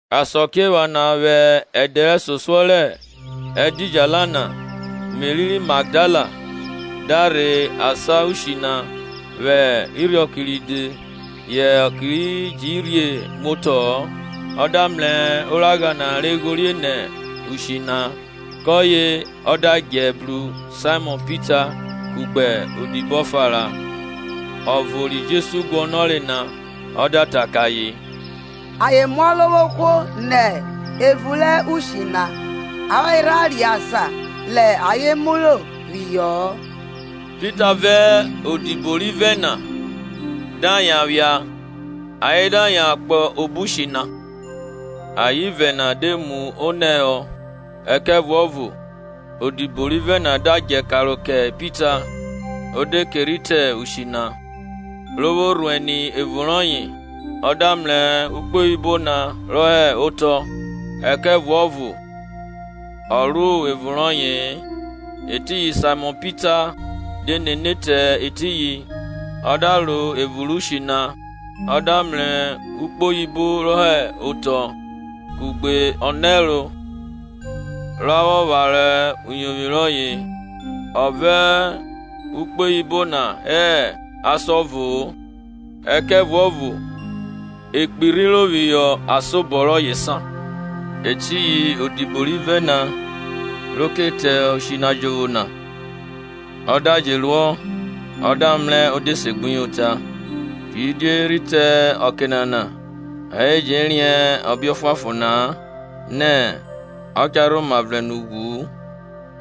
Asakiephana vwẹ ẹdẹ rẹsosuọ rẹ ẹdidjala na Meri ri Magdala da rhe asan ushi na vwẹ irhiọke ride, yẹ ọke ji rhie muotọ-ọ, ọ da mrẹ oragha na re ghorieri nẹ ushi na. Kọye ọ da djẹ, bru Saimọn Pita kugbe odibo ọfa ra, ọvo ri Jesu guọnọre na, ọ da ta kẹ ayen, Ayen mu Ọrovwohwo nẹ evun rẹ ushi na, avwanre rha riẹn asan rẹ ayen muro phihọ-ọ. Pita vẹ odibo rivẹ na da yan phia, ayen da yan kpo obo ushi na. Ayen ivẹ na de mu onẹ họ, ẹkẹvuọvo odibo rivẹ na da djẹ karo kẹ Pita o de ke rhi te ushi na. Ro vwo rhuẹn ni evun rọye, ọ da mrẹ ukpoyibo na re hẹ otọ, ẹkẹvuọvo ọ ro evun rọye-e. Etiyin Saimọn Pita, de nene te etiyin, ọ da ro evun rẹ ushi na; ọ da mrẹ ukpoyibo re hẹ otọ, kugbe amwa ra vwọ pharo uyovwi rọye, ọ vẹ ukpoyibo na hẹ asan ọvo-o ẹkẹvuọvo e kpirhiro phihọ asan obọ rọye san. Etiyin odibo rivẹ na, ro ke te ushi na jovwo na, ọ da je ruọ, ọ da mrẹ o de segbuyota. Kidie rhi te ọke nana ayen ji riẹn ọbe ọfuanfon na-a nẹ ọ cha rhoma vrẹn nẹ ughwu.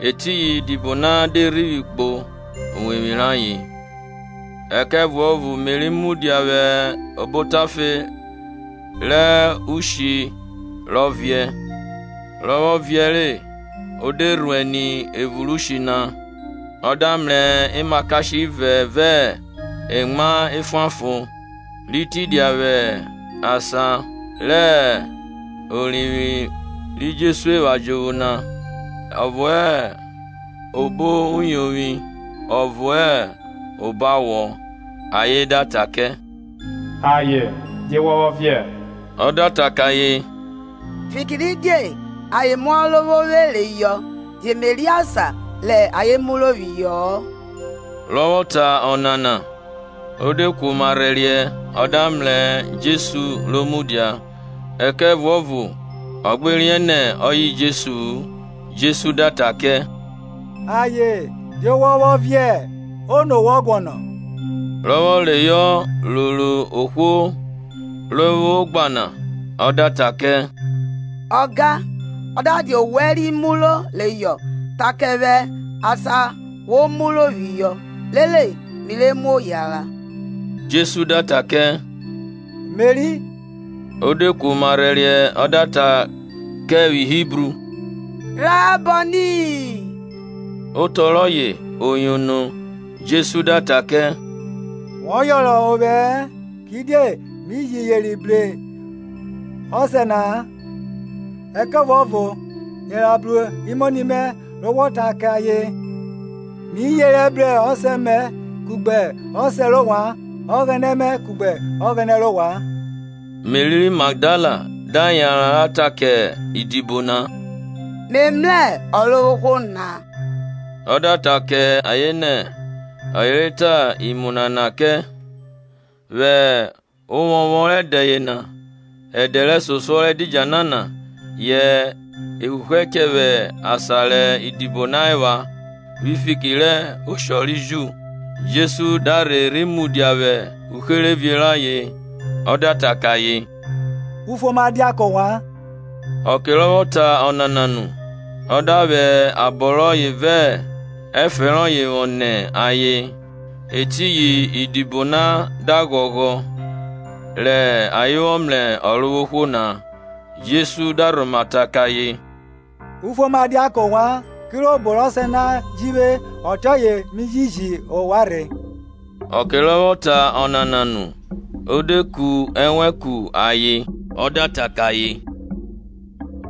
Etiyin idibo na dẹ rhivwi kpo uwevwi rayen. Ẹkẹvuọvo Meri Mudia vwẹ obo otafe rẹ ushi rọ viẹ, rọ vwọ viẹ re o de rhuẹn ni evun rẹ ushi na; ọ da mrẹ emakashe ivẹ vẹ emwa efuanfon, ri tidia vwẹ asan rẹ orivwi ri Jesu epha jovwo na, ọvo hẹ obo uyovwi ọvo hẹ obo awọ. Ayen da ta kẹ, Aye, die wọ vwọ viẹ? Ọ da ta kẹ ayen, Fikiridie ayen mu Ọrovwovwe reyọ, ye me riẹn asan rẹ ayen muro phihọ-ọ. Rọ vwọ ta ọnana, o de kuoma rhẹriẹ ọ da mrẹ Jesu ro mudia, ẹkẹvuọvo ọ gbe riẹn nẹ ọye Jesu-u. Jesu da ta kẹ, Aye, die wọ vwọ viẹ? Ono wọ guọnọ? Rọ vwọ reyọ roro ohwo ro vwo ogba na, ọ da ta kẹ, Ọga, ọ da dia owẹ ri muro reyọ ta kẹ vwẹ asan wo muro phihọ, rere mi re muo reyọ. Jesu da ta kẹ, Meri. Ọ de kuoma rhẹriẹ ọ da ta kẹ vwi Hibru, Raboni (otọ rọye oyono) Jesu da ta kẹ, Wọ yọnrọn ovwẹ-ẹ, kidiẹ mi ji yeri bru Ọsẹ na-a; ẹkẹvuọvo yanran bru imoni mẹ re wọ ta kẹ ayen, Mi yerẹ bru Ọsẹ mẹ kugbe Ọsẹ rẹ ovwan, Ọghẹnẹ mẹ kugbe Ọghẹnẹ rẹ ovwan. Meri ri Magdala da yanran ra ta kẹ idibo na, Me mrẹ Ọrovwohwo na; ọ da ta kẹ ayen nẹ ọye re ta imu nana kẹ. Vwẹ ovwọnvwọn rẹ ẹdẹ yena, ẹdẹ rẹsosuọ rẹ ẹdidjala na, yẹ e huhu ẹchẹ vwẹ asan rẹ idibo na epha, vwi fiki rẹ oshọ ri Ju, Jesu da rhe rhi mudia vwẹ uherevie rayen ọ da ta kẹ ayen, Ufuoma dia kẹ ovwan. Ọke rọ vwọ ta ọnana nu, ọ da vwẹ abọ rọye vẹ efẹn rọyẹ vwọ nẹ ayen. Etiyin idibo na da ghọghọ rẹ ayen vwọ mrẹ Ọrovwohwo na. Jesu da rhoma ta kẹ ayen, Ufuoma dia kẹ ovwan. Kirobo rẹ Ọsẹ na ji vwe, ọtiọye mi ji ji ovwan rhe. Ọke rọ vwọ ta ọnana nu, o de ku ẹnwẹn ku ayen, ọ da ta kẹ ayen,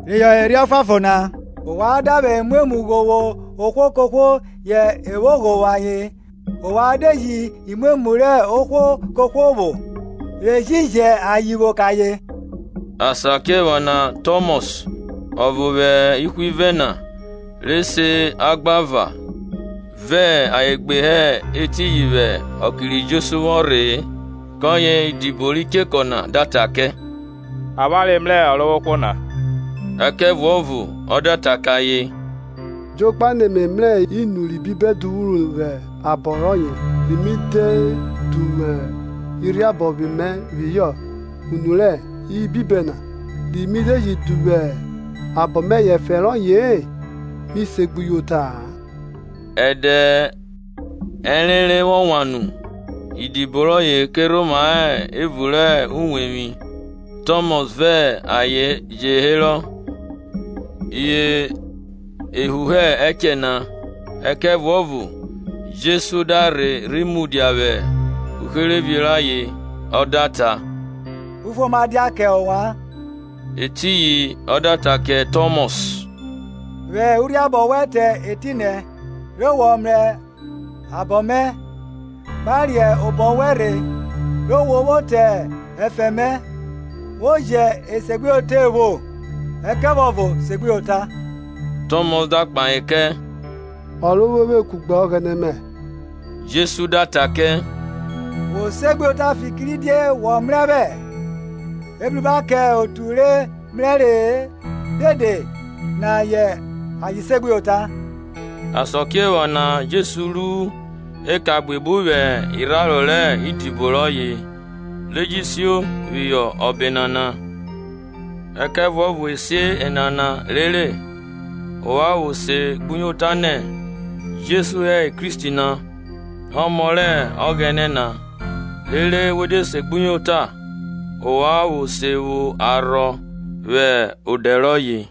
Reyọ Erhi Ọfuanfon na. Ovwan da vwẹ imwemwu ghovwo ohwo kohwo, yẹ e vwo ghovwo ayen; ovwan de ji imwemwu rẹ ohwo kohwo vwo, ye jẹ ayen vwo kẹ ayen. Asakiephana Tọmọs, ọvo vwẹ ihwivẹ na, re se Agbava, vẹ ayen gbe hẹ etiyin vwẹ ọke ri Jesu vwọ rhe-e. Kọye idibo ri chekọ na da ta kẹ, Avwanre mrẹ Ọrovwohwo na. Ẹkẹvuọvo ọ da ta kẹ ayen, Jokpa nẹ me mrẹ inu rẹ ibibẹ duvwuru vwẹ abọ rọye, ri mi de duvwu urhiabọ mẹ phihọ unu rẹ ibibẹ na-a, re mi de ji duvwu obọ mẹ phihọ efẹn rọye-e, mi se segbuyota-a. Ẹdẹ ẹrenre vwọ wan nu, idibo rọye ke rhoma hẹ evun rẹ uwevwi, Tọmọs vẹ ayen je herọ. Ye ehuhu echẹ na, ẹkẹvuọvo Jesu da rhe rhi mudia vwẹ uherevie rẹ ayen, ọ da ta, Ufuoma dia kẹ ovwan. Etiyin ọ da ta kẹ Tọmọs. Vwẹ urhiabọ wẹn te etinẹ, re wọ mrẹ abọ mẹ; gba riẹn obọ wẹn rhe, re wo vwo te ẹfẹn mẹ; wo jẹ esegbuyota evwo-o, ẹkẹvuọvo segbuyota. Tọmọs da kpahe kẹ, Ọrovwovwe kugbe Ọghẹnẹ mẹ! Jesu da da kẹ, Wo segbuyota fikiridie wọ mrẹ vwẹ? Ebruba kẹ otu re mrẹre-e dede na yẹ ayen segbuyota. Asakiephane Jesu ru eka buebu vwẹ irharo rẹ idibo rọye, re je sio phihọ ọbe nana; ẹkẹvuọvo e si enana rere ovwan vwo se segbuyota nẹ Jesu hẹ Kristi na, Ọmọ rẹ Ọghẹnẹ na, rere we de segbuyota ovwan vwo se vwo arhọ vwẹ odẹ rọye.